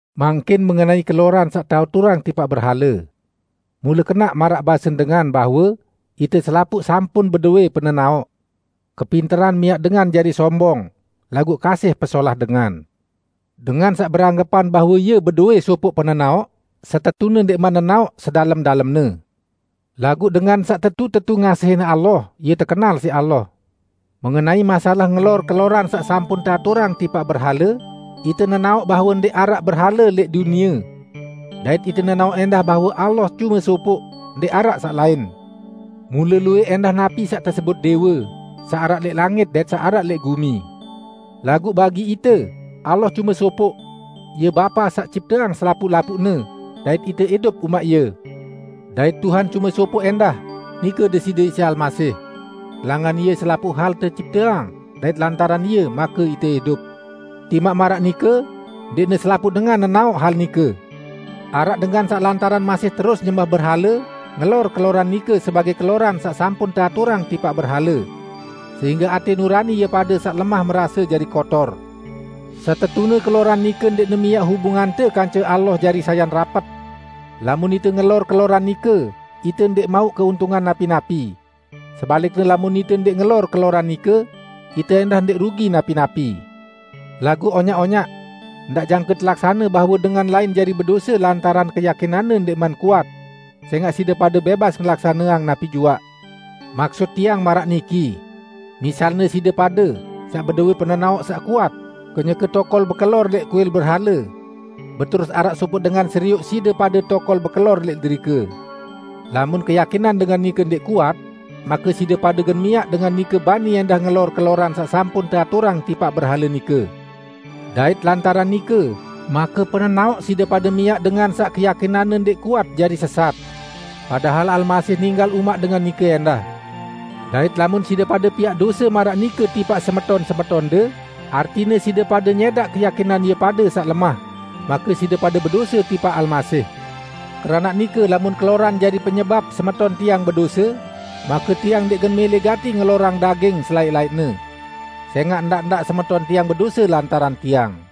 Mangkin mengenai keloran saq teaturang tipaq berhale. Mule kenaq maraq basen dengan bahwe, "Ite selapuq sampun bedowẽ penenaoq." Kepinteran miaq dengan jari sombong, laguq kasih pesolah dengan. Dengan saq beranggepan bahwe ie bedowẽ sopoq penenaoq, setetune ndẽqman nenaoq sedalem-dalemne. Laguq dengan saq tetu-tetu ngasihin Allah, ie tekenal siq Allah. Mengenai masalah ngelor keloran saq sampun teaturang tipaq berhale, ite nenaoq bahwe ndẽq araq berhale lẽq dunie. Dait ite nenaoq ẽndah bahwe Allah cume sopoq; ndẽq araq saq lain. Mule luwẽq ẽndah napi saq tesebut dẽwe; saq araq lẽq langit dait saq araq lẽq gumi. Laguq bagi ite, Allah cume sopoq. Ie Bapa saq cipteang selapuq-lapuqne, dait ite idup umaq Ie. Dait Tuhan cume sopoq ẽndah, nike Deside Isa Almasih. Langan Ie selapuq hal tecipteang, dait lantaran Ie make ite idup. Timaq maraq nike, ndẽqne selapuq dengan nenaoq hal nike. Araq dengan saq lantaran masih terus nyembah berhale, ngelor keloran nike sebagẽ keloran saq sampun teaturang tipaq berhale. Sehingge atẽ nurani ie pade saq lemah merase jari kotor. Setetune keloran nike ndẽqne miaq hubungante kance Allah jari sayan rapet. Lamun ite ngelor keloran nike, ite ndẽq mauq keuntungan napi-napi. Sebalikne lamun ite ndẽq ngelor keloran nike, ite ẽndah ndẽq rugi napi-napi. Laguq, onyaq-onyaq! Ndaq jangke telaksane bahwe dengan lain jari bedose -- lantaran keyakinanne ndẽqman kuat -- sẽngaq side pade bẽbas ngelaksaneang napi juaq. Maksut tiang maraq niki: Misalne side pade, saq bedowẽ penenaoq saq kuat, kenyeke tokol bekelor lẽq kuil berhale. Beterus araq sopoq dengan serioq side pade tokol bekelor lẽq derike. Lamun keyakinan dengan nike ndẽq kuat, make side pade gen miaq dengan nike bani ẽndah ngelor keloran saq sampun teaturang tipaq berhale nike. Dait lantaran nike, make penenaoq side pade miaq dengan saq keyakinanne ndẽq kuat jari sesat. Padahal Almasih ninggal umaq dengan nike ẽndah. Dait lamun side pade piaq dose maraq nike tipaq semeton-semetonde -- artine side pade nyẽdaq keyakinan ie pade saq lemah -- make side pade bedose tipaq Almasih. Keranaq nike, lamun keloran jari penyebap semeton tiang bedose, make tiang ndẽq gen mẽlẽ gati ngelorang daging selaẽq-laẽqne. Sẽngaq ndaq-ndaq semeton tiang bedose lantaran tiang.